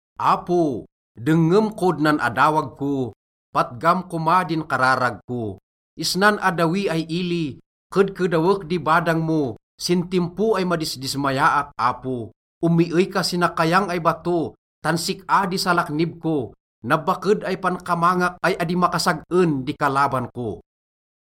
Apo, dengngem kod nan adawag ko, patgam koma din kararag ko. Isnan addawi ay ili, kedkedawek di badang mo sin timpo ay madisdismayaak, Apo. Omiey ka si nakayang ay bato tan sik-a di salaknib ko, nabaked ay pankamangak ay adi makasag-en di kalaban ko.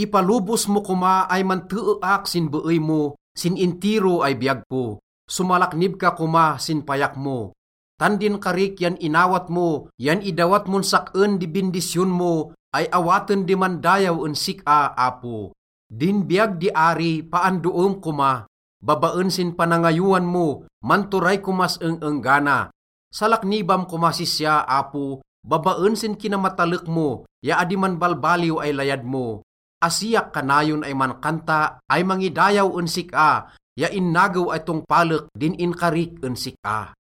Ipalobos mo koma ay manteeak sin beey mo sin intiro ay biyag ko. Somalaknib ka koma sin payak mo. Tan din karik yan inawat mo yan idawat mon sak-en di bindisyon mo ay awaten di mandayaw en sik-a, Apo. Din biyag di ari, paandoem koma. Babaen sin panangayowan mo, manturay komas eng-enggana. Salaknibam komas sisya, Apo, babaen sin kinamatalek mo ya adi manbalbaliw ay layad mo. Asiak kanayon ay mankanta ay mangidayaw en sik-a ya innagew ay tongpalek din inkarik en sik-a.